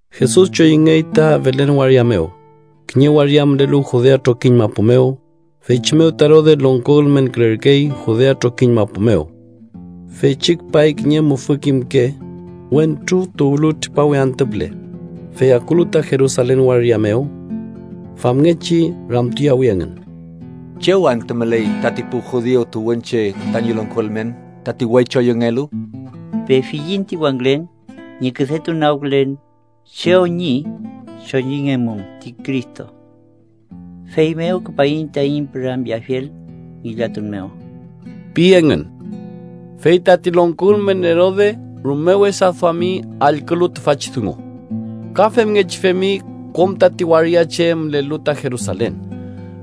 Jesus choyüngey ta Belen waria mew, kiñe waria mülelu Judea trokiñ mapu mew, feychi mew ta Erode longko ülmenkülerkey Judea trokiñ mapu mew. Feychi küpay kiñe mufü kimke wentru tuwlu tripawe antü püle. Fey akulu ta Jerusalen waria mew, famngechi ramtuyawi engün: —¿Chew anta müley tati pu judiu tuwünche tañi longko ülmen, tati we choyüngelu? Pefiyiñ ti wangülen ñi küdetunagkülen chew ñi choyüngemum ti Cristo, feymew küpaiñ taiñ püramyeafiel ngillatun mew ―pi engün. Fey tati longko ülmen Erode rume wesa duami allkülu tüfachi dungu. Ka femngechi femi kom tati waria che mülelu ta Jerusalen.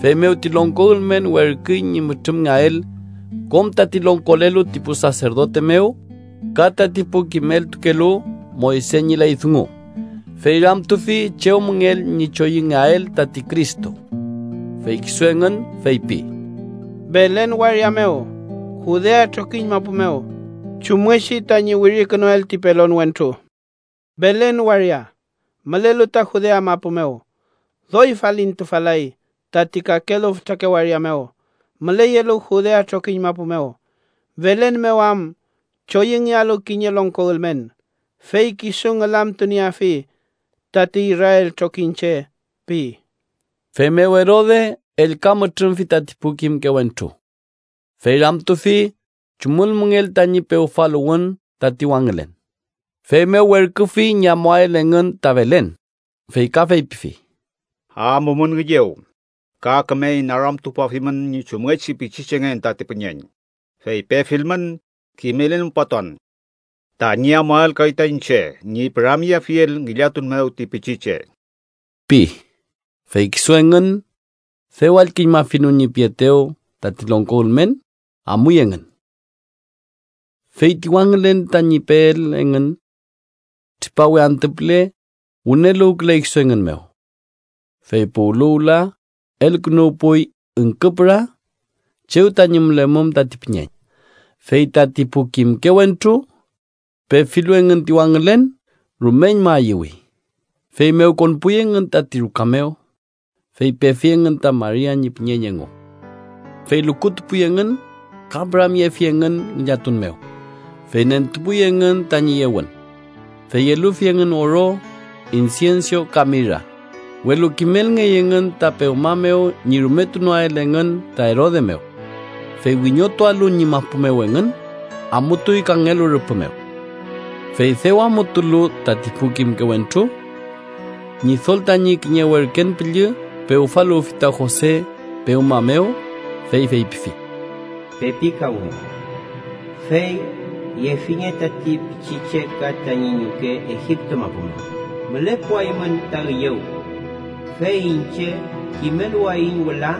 Feymew ti longko ülmen werküy ñi mütrümngeael kom tati longkolelu ti pu saserdote mew ka tati pu kimeltukelu Moyse ñi ley dungu, fey ramtufi chew müngell ñi choyüngeael tati Cristo. Fey kisu engün feypi: —Belen waria mew Judea trokiñ mapu mew, chumngechi tañi wirikünuel ti pelon wentru: ‘Belen waria, mülelu ta Judea mapu mew, doy falintufal-lay tati kakelu fütrake waria mew müleyelu Judea trokiñ mapu mew. Belen mew am choyüngealu kiñe longko ülmen, fey kisu ngülamtunieafi tati Israel trokiñche’ pi. Feymew Erode ellka mütrümfi tati pu kimke wentru, fey ramtufi chumül müngell tañi pewfaluwün tati wangülen. Feymew werküfi ñi amuael engün ta Belen, fey ka feypifi: —Amumün üyew, ka küme inaramtupuafimün ñi chumngechi pichichengen tati püñeñ, fey pefilmün, kimelelmupatuan, tañi amuael kay ta iñche ñi püramyeafiel ngillatun mew ti pichiche ―pi. Fey kisu engün, dew allküñmafilu ñi pietew tati longko ülmen, amuy engün. Fey ti wangülen tañi peel engün tripawe antü püle wüneluwküley kisu engün mew, fey puwlu wüla elkünuwpuy üngküpüra chew tañi mülemum tati püñeñ. Fey tati pu kimke wentru, pefilu engün ti wangülen, rumeñma ayüwi. Feymew konpuy engün tati ruka mew, fey pefi engün ta Maria ñi püñeñ engu, fey lukutupuy engün ka püramyefi engün ngillatun mew. Fey nentupuy engün tañi yewün, fey elufi engün oro, insienso ka mira. Welu kimelngey engün ta pewma mew ñi rumetunoael engün ta Erode mew. Fey wiñotualu ñi mapu mew engün, amutuy kangelu rüpü mew. Fey dew amutulu tati pu kimke wentru, Ñidol tañi kiñe werken püllü pewfaluwfi ta Jose pewma mew, fey feypifi: “¡Pepikawnge! Fey yefinge tati pichiche ka tañi ñuke Egipto mapu mew. Mülepuaymün ta üyew, fey iñche kimeluwayiñ wüla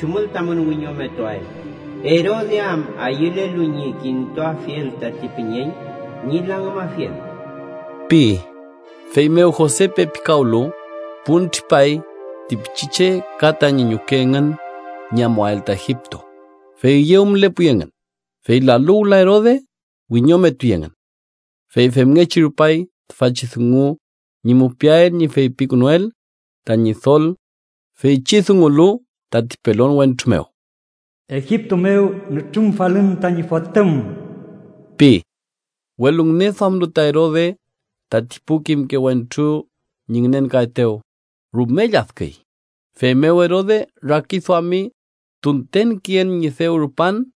chumül tamün wiñometuael, Erode am ayülelu ñi kintuafiel tati püñeñ ñi langümafiel” pi. Feymew Jose pepikawlu, pun tripay ti pichiche ka tañi ñuke engün ñi amuael ta Egipto, fey üyew mülepuy engün. Fey lalu wüla Erode, wiñometuy engün. Fey femngechi rupay tüfachi dungu ñi mupiael ñi feypikünuel ta Ñidol feychi dungulu tati pelon wentru mew: “Egipto mew mütrümfalün tañi Fotüm” pi. Welu ngüneduamlu ta Erode tati pu kimke wentru ñi ngünenkaetew, rume lladküy. Feymew Erode rakiduami tunten küyen ñi dew rupan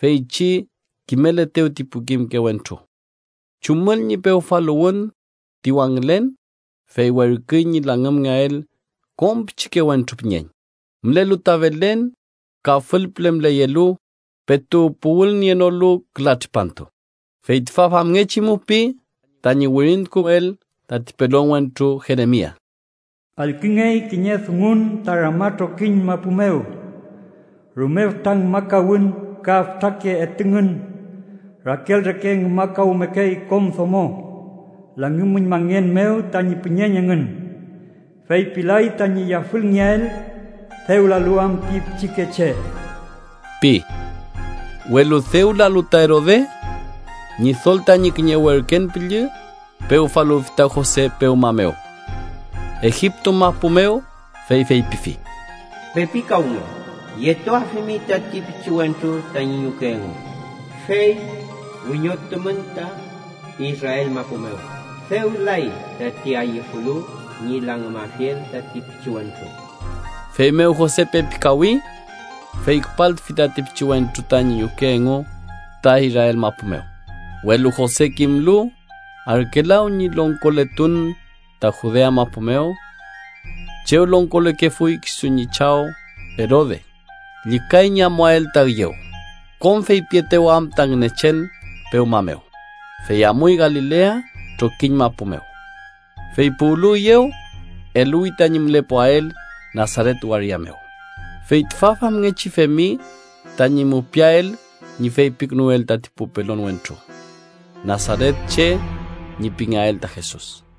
feychi kimeletew ti pu kimke wentru chumül ñi pewfaluwün ti wangülen, fey werküy ñi langümngeael kom pichikewentru püñeñ, mülelu ta Belen ka fülpüle müleyelu, petu puwülnienolu küla tripantu. Fey ta famngechi mupiy tañi wirintukuel tati pelon wentru Jeremia: “Allküngey kiñe dungun ta Rama trokiñ mapu mew, rume fütra ngümakawün ka fütrake etüngün. Rakel reke ngümakawmekey kom domo langümüñmangen mew tañi püñeñ engün, fey pilay tañi yafülngeael, dew lalu am ti pichikeche” pi. Welu dew lalu ta Erode, Ñidol tañi kiñe werken püllü pewfaluwfi ta Jose pewma mew, Egipto mapu mew, fey feypifi: “¡Pepikawnge! Yetuafimi tati pichiwentru tañi ñuke engu, fey wiñotumün ta Israel mapu mew. Dew lay tati ayüfulu ñi langümafiel tati pichiwentru.” Feymew Jose pepikawi, fey küpaltufi tati pichiwentru tañi ñuke engu ta Israel mapu mew. Welu Jose kimlu Arkelaw ñi longkoletun ta Judea mapu mew chew longkolekefuy kisu ñi chaw Erode, llükay ñi amuael ta üyew, kom feypietew am ta Ngünechen pewma mew, fey amuy Galilea trokiñ mapu mew. Fey puwlu üyew, eluwi tañi mülepuael Nasaret waria mew. Fey tüfa famngechi femi tañi mupiael ñi feypikünuel tati pu pelon wentru: Nasaretche ñi pingeael ta Jesus.